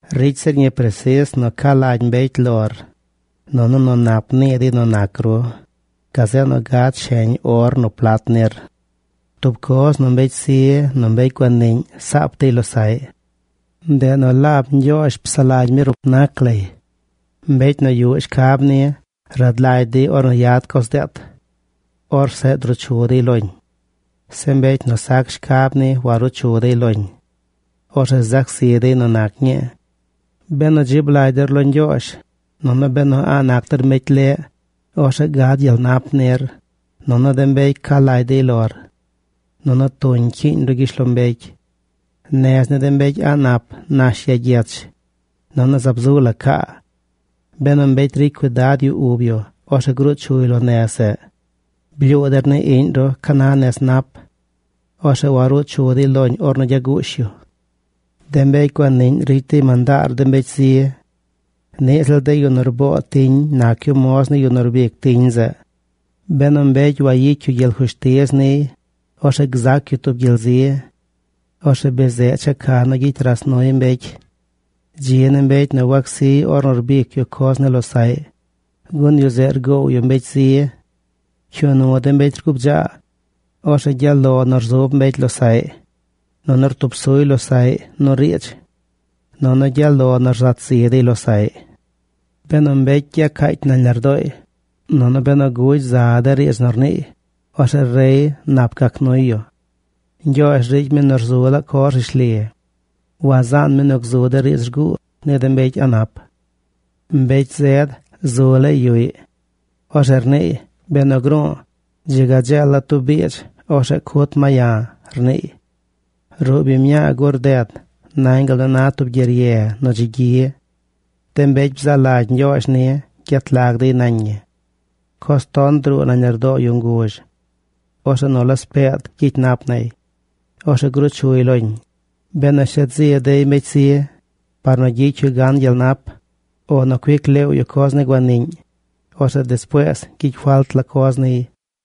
Ricy zir ñi presis nu ca lagy mbecy lor, nunu nu nap nii dey nu nac ru gazeꞌ nu gad sheñ or nu plat nir. Tub coz nu mbecy zi nu mbecy guaniꞌñ saap dey losaꞌy. Ndeꞌ nu laab Ñgyoozh psaꞌ lagy mi rup nac lay. Mbecy nu yuꞌ shcab ni rad lagy dey ornu yad coz deet. Orzeꞌ druu chu dey loñ. Zeꞌ mbecy nu sac shcab ni waruu chu dey loñ. Orzeꞌ zac zi dey nu nac ñii. Benu dzib lagy der lo Ñgyoozh, nunu benu a̱ꞌ nac der mbecy leꞌ, orzeꞌ gad gyel nap nir, nunu de mbecy ca lagy dey lor, nunu tuñ cyiiñ ru gyishlombecy. Nez ni de mbecy a̱ꞌ nap nash ya gyech, nunu zaab zu la caa. Benu mbecy ricy cuidad yu ub yu, orzeꞌ gruu chuy lo nez zeꞌ. Blyuu der ni iꞌñ ru ca na nez nap. Orzeꞌ waruu chu dey loñ ornu gyaguush yu. De mbecy guaniꞌñ ricy dey mandaar de mbecy zi. Niꞌ ziꞌl de yu nu rboo tiñ nac yu moz ni yu nu rbic tiñ zeꞌ. Benu mbecy wayicy yu gyel fushtiz niy, orzeꞌ gzac yu tub gyel zi. Orzeꞌ be zeꞌ checa nu gyicy ras nuy mbecy. Dzi ni mbecy nu wacsiy ornu rbicy yu coz ni losaꞌy, gun yu zeꞌ rgoow yu mbecy zi. Pcyuu nu de mbecy rguu bdzaa. Orzeꞌ gyaꞌ lo nu rzub mbecy losaꞌy, nunu rtub suy losaꞌy nu riidz. Nunu gyaꞌ lo nu rzat zi dey losaꞌy. Benu mbecy gyacaacy nañ lardooy, nunu benu gugy za de riidz nu rniiy, orzeꞌ rey nap gac nuy yu. Ñgyoozh ricy mi nu rzu laa coz rishli. Wazaan mi nu gzu de riidz rguu ni de mbecy a̱ꞌ nap. Mbecy zed zu laay yuꞌy. Orzeꞌ rniiy: “Benu gru̱u̱, dzi ga dzeela̱ tub biidz. Orzeꞌ cut ma ya̱”, rniiy. Ruꞌ biñ mñaa gur rded nañ gal nu na tub gyerye nu dzi gyi. De mbecy bzaa lagy Ñgyoozh ni gyet lag dey nañ ñi. Coz ton druu nañ lardoo yu nguzh. Orzeꞌ nu laspeed gyicy nap nay. Orzeꞌ gruu chuy loñ. Benu shet zi dey mbecy zi par nu gyicy yu gan gyel nap, o nu cuic leew yu coz ni guaniꞌñ, orzeꞌ despuees gyicy falt la coz niy.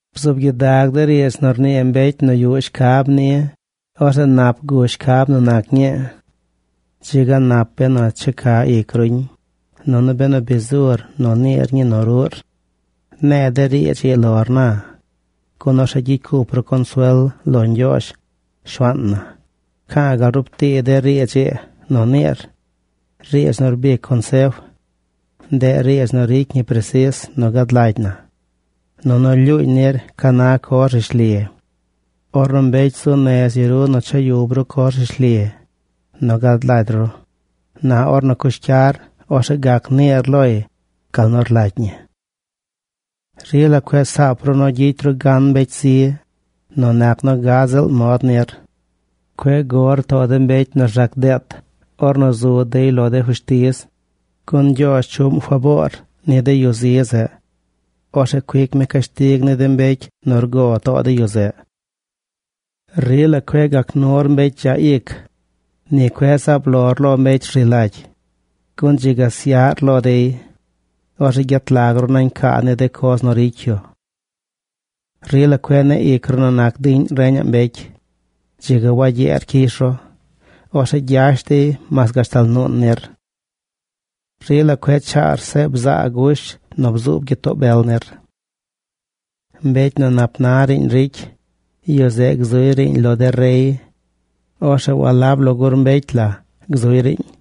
Bzuub gyidag de riidz nu rnii mbecy nu yuꞌ shcab ni. Orzeꞌ nap gush shcab nu nac ñii. Dzi ga nap benu checa ic ruñ, nunu benu bi zur nu niir ñii nu ruꞌr. Ne̱e̱ de riidz ii lor na, gun orzeꞌ gyicy cup ru consuel lo Ñgyoozh, Shuaan na. Pca̱a̱ gal rub tii de riidz ii nu niir, riidz nu rbic consef. Ndeꞌ riidz nu ricy ñi presis nu gad lagy na. Nunu lyuuñ nir ca na coz rishli. Ornu mbecy zu nez yu ru nu cha yub ru coz rishli nu gad lagy ru, na ornu cyush cyar, orzeꞌ gac niir loy gal nu rlagy ñi. Rila cueꞌ saap ru nu gyicy ru gan mbecy zi nu nac nu gad ziꞌl mod nir. Cueꞌ gor too de mbecy nu rzaac deet ornu zu dey lo de fushtiz. Gun Ñgyoozh chuꞌm faboor ni de yu zi zeꞌ. Orzeꞌ cuic mi cashtig ni de mbecy nu rgo too de yu zeꞌ. Rila cueꞌ gac nur mbecy dzaꞌ ic. Ni cueꞌ zaab lor lo mbecy rzi lagy. Gun dzi ga syaꞌr lo dey. Orzeꞌ gyet lag ru nañ caa ni de coz nu ricy yu. Rila cueꞌ neꞌ ic ru nu nac diꞌñ reñaꞌ mbecy. Dzi ga wagyeer cyish ru. Orzeꞌ gyash dey mas gashtal nuun nir. Rila cueꞌ chaar seꞌ bzaa gush nu bzuub gyitoo bel nir. Mbecy nu nap na riiñ ricy yu, yu zeꞌ gzuy riiñ lo de rey. Orzeꞌ walab lo gur mbecy la gzuy riiñ.